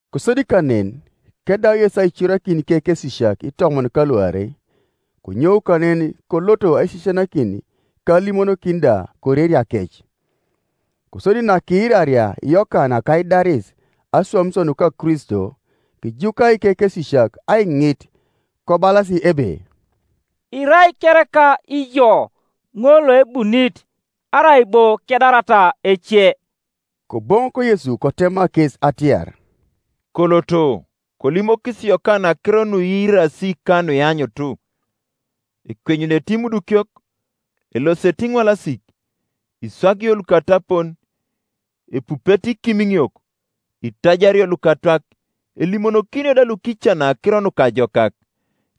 Kosodi kanen, kedau Yesu aicorakin ikekesisiak itomon ka luarei, konyou kanen kolot aisisianakin ka alimonokin da koreriakec. Kosodi nakiiraria Yokana kaidaris aswamisio nuka Kristo, kijuka ikekesisiak aiŋit, kobalas ebe, “Irai kereka ijo ŋol loebunit, arai bo kedarata ece?” Koboŋok Yesu kotema kes atiar, “Koloto, kolimokis Yokana akiro nuiirasi ka nuianyut: Ekwenyunete imudukiok, elosete iŋwalasik, iswagio lukatapon, epupete ikimiŋiok, itajario lukatwak, elimonokinio da lukican akiro nukajokak.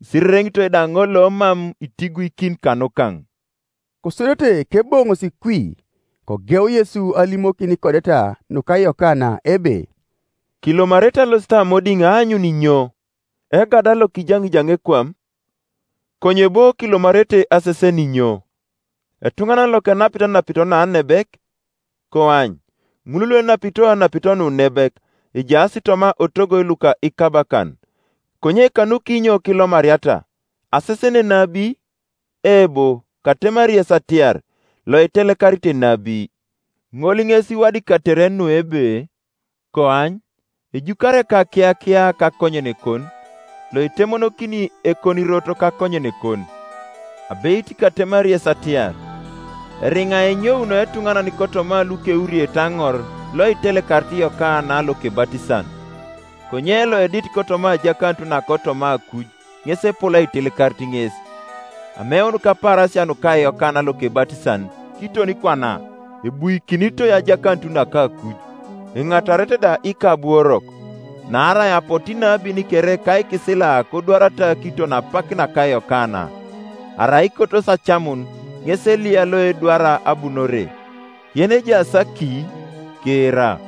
Isirereŋitoi da ŋol lomam itiguikin kanukaŋ.” Kosodete keboŋosi kwi, kogeu Yesu alimokin ikodeta nuka Yokana ebe, “Kilomarete alosit amodiŋ aanyun inyo? Egada lokijaŋijani ekwam? Konye bo kilomarete asesen inyo? Etuŋanan lokenapit anapito naanebek? Koany, ŋul luenapito anapito nuunebek ejaas toma otogoi luka ikabakan. Konye kanukinyo kilomariata? Asesen enabi? Eebo, katemari yes atiar, Loitelekarit enabi. Ŋol ŋes iwadikatere nu ebe, ‘Koany, ejukari ekakiyakia kakonyenekon, Loitemonokini ekonirot kakonyenekon.’ Abeit katemari yes atiar, eriŋa enyouno etuŋanan kotoma lukeuriete aŋor loitelekarit Yokana Lokebatisan; konye loedit kotoma ajakanut nakotoma akuj ŋes epol aitelekarit ŋes. Ameun kapaarasia nuka Yokana Lokebatisan kiton kwana ebuikinitoi ajakanut naka akuj, enatarete da ikabuorok. Naarai apotu inabin kere ka ikisila kodwarata kiton apak naka Yokana; Arai ikotosi acamun, ŋes Eliya loedwara abunore. Yenejaas aki kiira.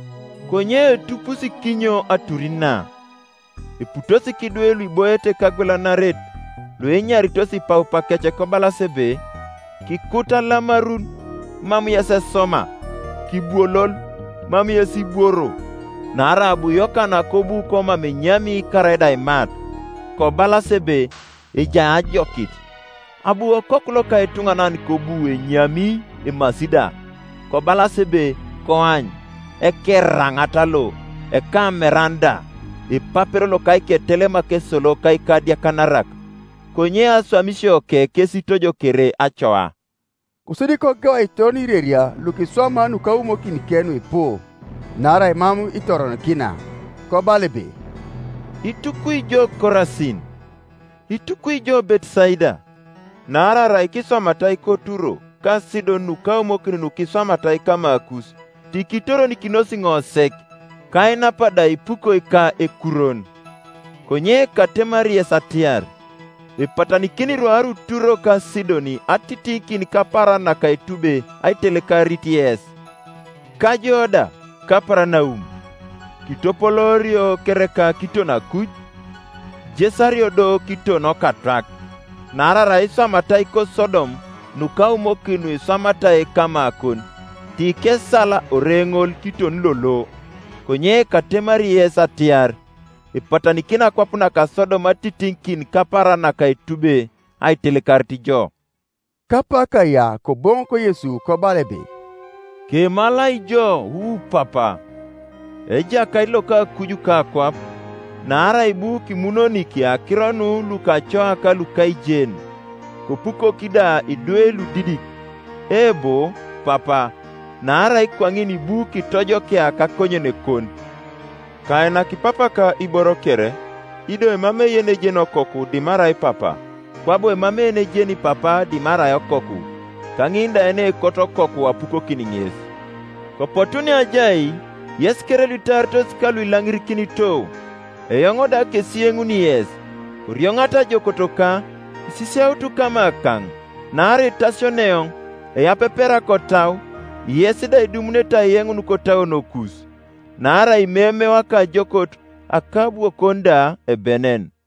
“Konye etupusi kinyo atur na? Eputos kidwe luiboiete kagwelanaret luenyaritos ipaupakec kobalas ebe, ‘Kikut alamarun, mam yes esoma; Kibwolol, mam yes ibworo.’ Naarai abu Yokana kobu komam enyami karaida aimat, kobalas ebe, ‘Ejai ajokit.’ Abu Okoku loka etuŋanan kobu enyami emasi da, kobalas ebe, ‘Koany, ekeraŋat lo, ekameran da, epapero loka iketelemak esolo ka ikadiakanarak!’ Konye aswamisioke kes itojokere acoa.” Kosodi kogeu aitoron ireria lukiswamaa nukaumokinike nuipu, naarai mam itoronikina. Kobala ebe, “Itukwi ijo Korasin! Itukwi ijo Betesaida! Naarai arai kiswamatai koTuro ka Sidon nukaumokin nukiswamatai kamakus, ti kitoronikinos ŋo sek, ka ainap da ipukoi ka ekurwon. Konye katemari yes atiar, Epatanikini rwaru Turo ka Sidon atitiŋikin kapaaran naka etube aitelekarit yes. Ka jo da, Kaparanaum, kitopoloorio kereka kiton akuj? Kijesario do kiton Okatwak, Naarai arai kiswamatai koSodom nukaumokin nukiswamatai kamakon, ti kesal ore ŋol kiton lolo. Konye katemari yes atiar, Epatanikini akwap naka Sodom atitiŋikin kapaaran naka etube aitelekarit jo.” Kapak kaya Koboŋok Yesu kobala ebe, “Kemalai jo, wu Papa, Ejakait loka akuj ka akwap, naarai ibu kimunonik akiro nu lukacoa ka lukaijen, kopukok da idwe Iudidik; eebo, Papa, naarai kwaŋin ibu kitojokia kakonyenekon. Kainak Papaka iboro kere; ido emamei yenejeni Okoku dimarai Papa, kwabo emamei yenejeni Papa dimarai Okoku, ka ŋin da yenekot Okoku apukokin ŋes. Kopotu neajai, yes kere luitaaritos ka lukilaŋirikinito, eoŋ da kesiyenuni yes. Korioŋata ajookotoka, kisisiautu kamakaŋ; naarai etasiono eoŋ, eyapepera kotau, yes da idumunete aiyeŋun kotauonokus. Naarai imeimeo akajookot, akabwokon da ebenen.”